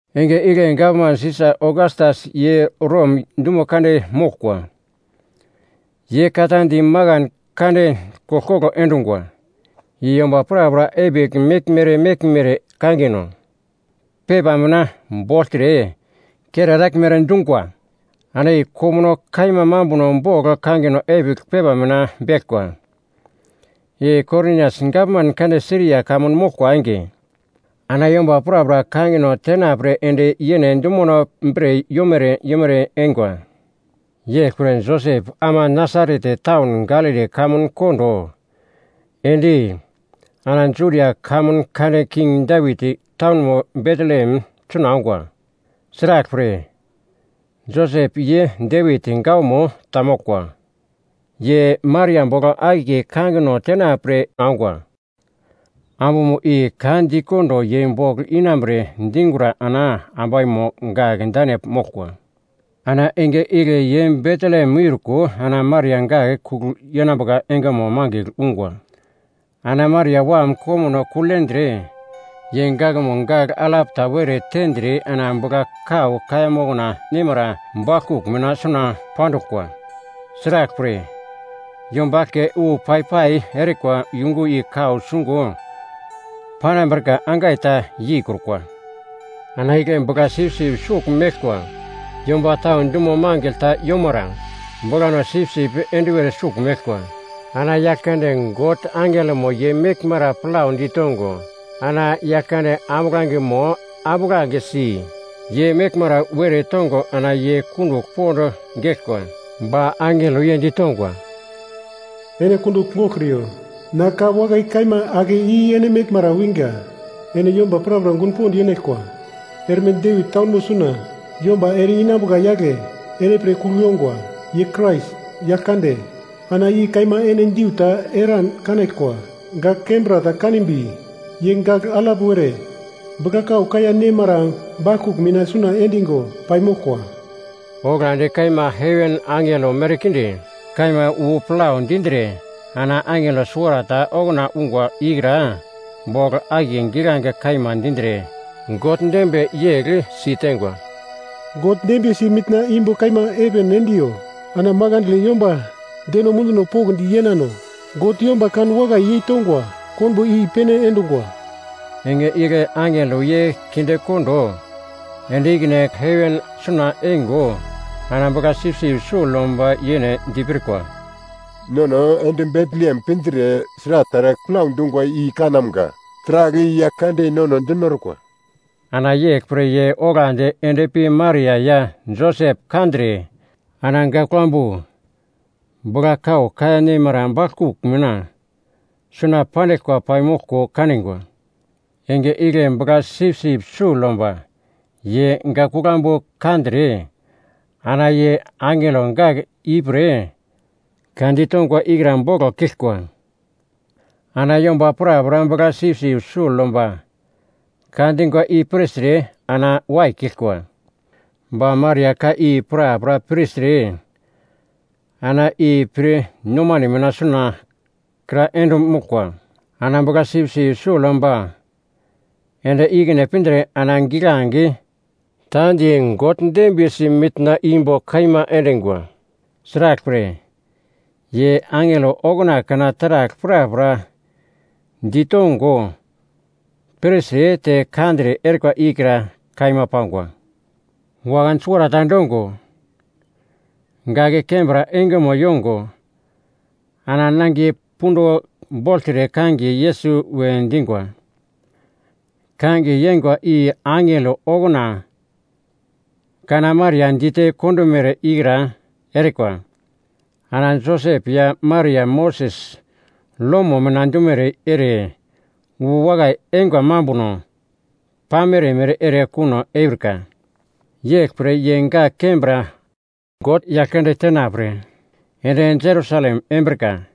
Enge igle gavman Sisa Ogastas ye Rom dumo kande moglkwa. Ye ka ta di makan kande koglkoglo endungwa, i yomba prapra epigl meglmere meglmere kangino pepa mina bogltre kere eraglmere dungwa. Ana i komuno kaima mambuno bogl kangino epigl pepa mina beglkwa, i Korinias gavman kande Siria kamun moglkwa enge. Ana yomba prapra kangino tenapre ende yene dumono bre yomere yomere eingwa. Yeglpre Josep ama Nasaret taun Galili kamun kondo, ende, ana Judia kamun kande King Devit taunmo Betlehem suna ongwa. Sraglpre, Josep ye Devit gawamo ta moglkwa. Ye Maria bogl akiye kangino tenapre ongwa. Ambumo i ka di kondo ye bogl inambre dingura ana ambaimo gak dane moglkwa. Ana enge igle ye Betlehem miurko ana Maria gak kugl yenambuka engemo mangigl ungwa. Ana Maria wam komuno kugl yendre, ye gakmo gagl alap ta were tendre ana bugla-kau kaiya mokna neimara baglkugl mina suna panduglkwa. Sraglpre, yomba eglke wu pai-pai erikwa yungu i kau sungo panambrika angai ta yeikrukwa. Ana igle bugla-sipsip sugl meglkwa yomba tau dumo mangigl ta yomara, buglano sipsip enduwer sugl meglkwa. Ana Yaglkande God angelomo ye meglmara plau ditongo ana Yaglkande ambuglangemo ambuglangesi ye meglmara were tongo ana ye kundugl pond geglkwa. Ba angelo ye ditongwa, “Ene kundugl goglkriyo. Na ka wakai kaima ake i ene meglmara winga ene yomba prapra gun pond yenaglkwa. Erme Devit taunmo suna yomba ere-inambuka yagle ene pre kugl yongwa. Ye Krais, Yaglkande. Ana i kaima ene diu ta eran kanaglkwa. Gak kembra ta kanimbi, ye gagl alap were bugla-kau kaiya nemara baglkugl mina suna endingo paimoglkwa.” Oglandi kaima heven angelo merkinde kaima wu plau dindre ana angelo suwarata ta okuna ungwa ikra bogl akiye giglange kaima dindre God dembiye yegl siteingwa, “God dembiyesi mitna imbo kaima heven endiyo, Ana makandle yomba deno munduno pokndi yenano, God yomba kan wakai yeitongwa konbo i-pene endungwa.” Enge igle angelo ye kinde kondo ende ikine heven suna eingo ana bugla-sipsip sugl yomba yene dipirkwa, “Nono ende Betlehem pindre sragl taragl plau dungwa i kanamga. Taragl i Yaglkande nono dinorkwa.” Ana yeglpre ye oglandi ende pi Maria ya Josep kandre, ana gak kuglambu bugla-kau kaiya neimara baglkugl mina suna pandiglkwa paimoglko kaningwa. Enge igle bugla-sipsip sugl yomba ye gak kuglambu kandre ana ye angelo gak ipre ka ditongwa ikra boglo kiglkwa. Ana yomba prapra bugla-sipsip sugl yomba ka dingwa i pirtre ana waikiglkwa. Ba Maria ka i prapra pirtre ana i pir nomane mina suna kra ende moglkwa. Ana bugla-sipsip sugl yomba ende ikine pindre ana giglange ta di God dembiyesi mitna imbo kaima endingwa. Sraglpre, ye angelo okuna kana taragl prapra ditongo pirtre te kandre erikwa ikra kaima pangwa. Wakan suwarata endongo, gak kembra engemo yongo ana nangiye punduno bogltre kangiye Yesus we dingwa. Kangiye yeingwa i angelo okuna kana Maria dite kondomere ikra erikwa. Ana Josep ya Maria Moses lomo mina dumere ere wu wakai eingwa mambuno pamere mere ere kuno eurika. Yeglpre ye gak kembra God Yaglkande tenapre yend Jerusalem embrika.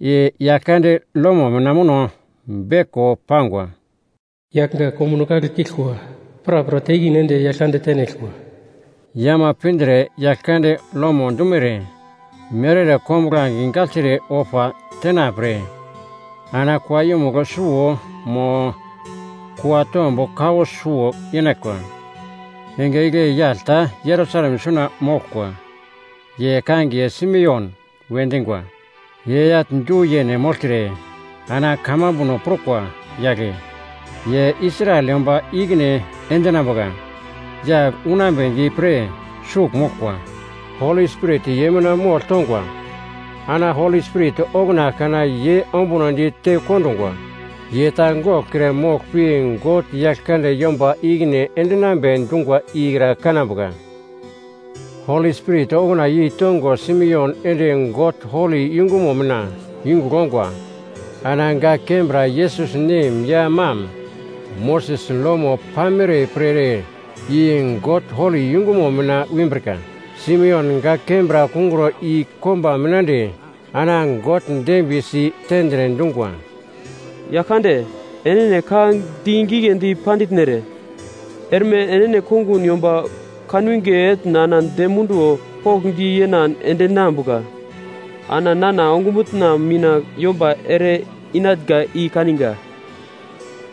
I Yaglkande lomo mina muno beglko pangwa, “Yagl gak komuno kagle kiglkwa prapra te ikine ende Yaglkande tenaglkwa.” Ye ama pindre Yaglkande lomo dumere mere ere kombuglange gagltre ofa tenapre, ana kua yumugl suwo mo kua tomb kowo suwo yenaglkwa. Enge igle yagl ta Jerusalem suna moglkwa, ye kangiye Simeon we dingwa. Ye yagl du-yene mogltre ana kamambuno prukwa yagle. Ye Israel yomba ikine endinambuka yagle unambedi pre sugl moglkwa, Holi Spirit ye mina mogl tongwa. Ana Holi Spirit okuna kana ye ombunodi te kondungwa. Ye ta goglkre mogl pi God Yaglkande yomba ikine endinambe dungwa ikra kanambuka. Holi Spirit okuna yeitongo Simeon ende God holi yungumo mina yungugl ongwa. Ana gak kembra Yesus nem ya mam Moses lomo pamere pre ere i God holi yungumo mina wimbrika. Simeon gak kembra kungro i komba mina ende ana God dembiyesi tendre dungwa, “Yaglkande, enene ka di giglendi panditnere. Erme enene kongun yomba kanwinge etn ana dem munduwo pokndi yenan endeinambuka. Ana nana ongumutna mina yomba ere-inatnga i kaninga.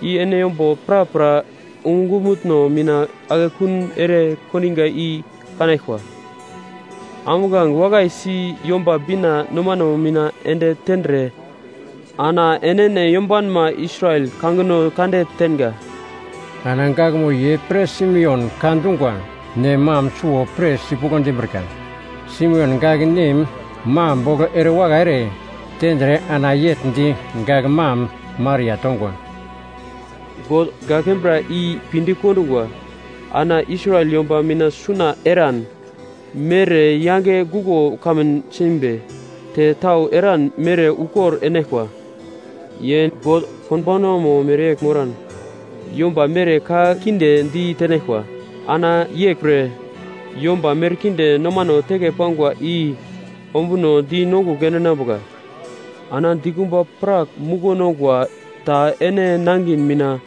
I ene yomba prapra ongumutno mina akekun ere kondinga i kanaglkwa. Ambuglange wakai si Yomba Bina nomano mina ende tendre ana enene yombanma Israel kangino kande tenga.” Ana gakmo ye pre Simeon ka dungwa i nem mam suwo pir sipuglo dimbrika. Simeon gak nem mam bogl ere wakai ere tendre ana yegl di gak mam Maria tongwa, “God gak kembra i pinde i kondungwa. Ana Israel yomba mina suna eran mere yange guglo kamun simbi, te tau eran mere ukor enaglkwa. Ye God konbaunamo mereyegl moran, yomba mere ka kinde di tenaglkwa. Ana yeglpre yomba merkinde nomano teke pangwa i ombunodi nongugl endinambuka. Ana dikumba prak muglo nongwa ta ene nangin mina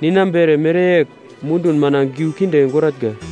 ninambere mereyegl, mundun mina giu kinde goratnga.”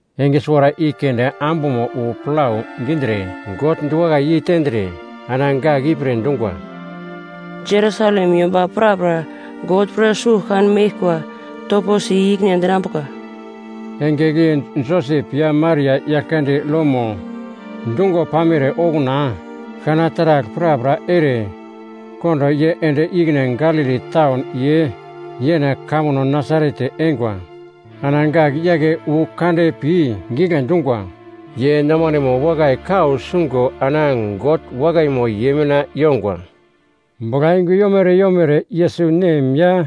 Enge suwara i keunde ambumo wu plau dindre, God diwakai yei tendre, ana gak i pre dungwa, “Jerusalem yomba prapra God pre sugl kan meglkwa topo si i-ikine endinambuka.” Enge igle Josep ya Maria Yaglkande lomo dungo pamere okuna kana taragl prapra ere kondo ye ende ikine Galili taun ye yene kamuno Nasaret eingwa. Ana gak yake wu kande pi gigle dungwa. Ye nomanemo wakai kau sungo ana God wakaimo ye mina yongwa. Buglayungu yomere yomere Yesus nem ya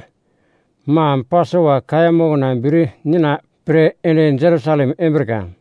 mam Pasova kaiya mokna bir nina pre ende Jerusalem embrika.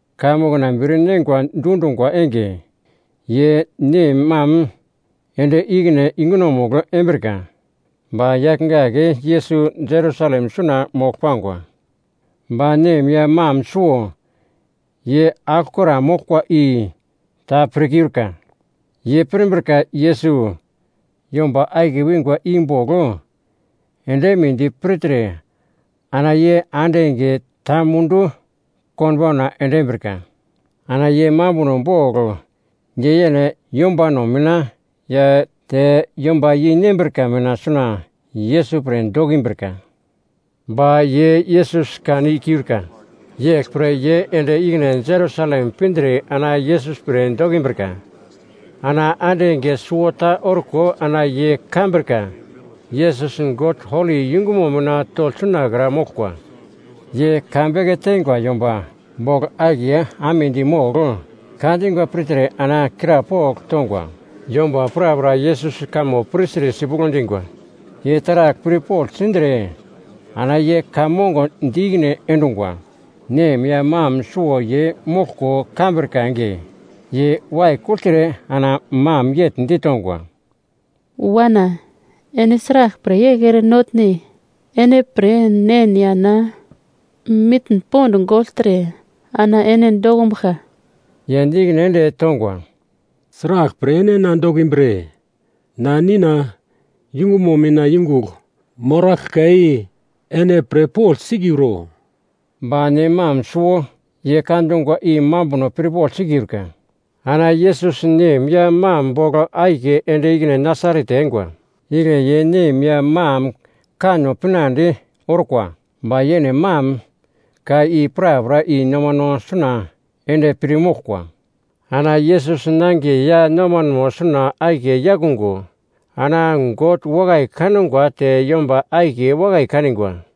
Kaiya mokna bir neingo dundungwa enge, ye nem mam ende ikine yungunomugl embrika, ba yagl gak Yesus Jerusalem suna mogl pangwa. Ba nem ya mam suwo ye aglokra moglkwa i ta pirkiurka. Ye pirmbrika Yesus yomba akiye wingwa i bogl ende eimedi pirtre ana ye ande enge ta mundu konbauna ende embrika. Ana ye mambuno bogl ye yene yombano mina ya te yomba yei nembrika mina suna Yesus pre dokimbrika. Ba ye Yesus kan i-kiurka, yeglpre ye ende ikine Jerusalem pindre ana Yesus pre dokimbrika. Ana ande enge suwota orko ana ye kambrika Yesus God holi yungumo mina togl sunakra moglkwa. Ye ka beke teingwa yomba bogl akiye amedi mogl, ka dingwa pirtre ana krapogl tongwa. Yomba prapra Yesus kamo pirtre sipuglo dingwa, ye taragl pirpogl sindre ana ye ka mongo di ikine endungwa. Nem ya mam suwo ye moglko kambrika enge. Ye waikugltre ana mam yegl ditongwa, “Wana, ene sraglpre yegl ere notne? Ene pre nen ya na mitn pond gogltre ana ene dokumbuglka.” Ye di ikine ende tongwa, “Sraglpre ene na dokimbre? Na, Nina yungumo mina yungugl moraglka i ene pirpogl sikiuro?” Ba nem mam suwo, ye ka dungwa i mambuno pirpogl sikiurka. Ana Yesus nem ya mam bogl akiye ende ikine Nasaret eingwa. Igle ye nem ya mam kanno pinande orkwa. Ba yene mam ka i prapra i nomano suna ende pir moglkwa. Ana Yesus nangiye ya nomanemo suna akiye yakungo, ana God wakai kangwa te yomba akiye wakai kanigwa.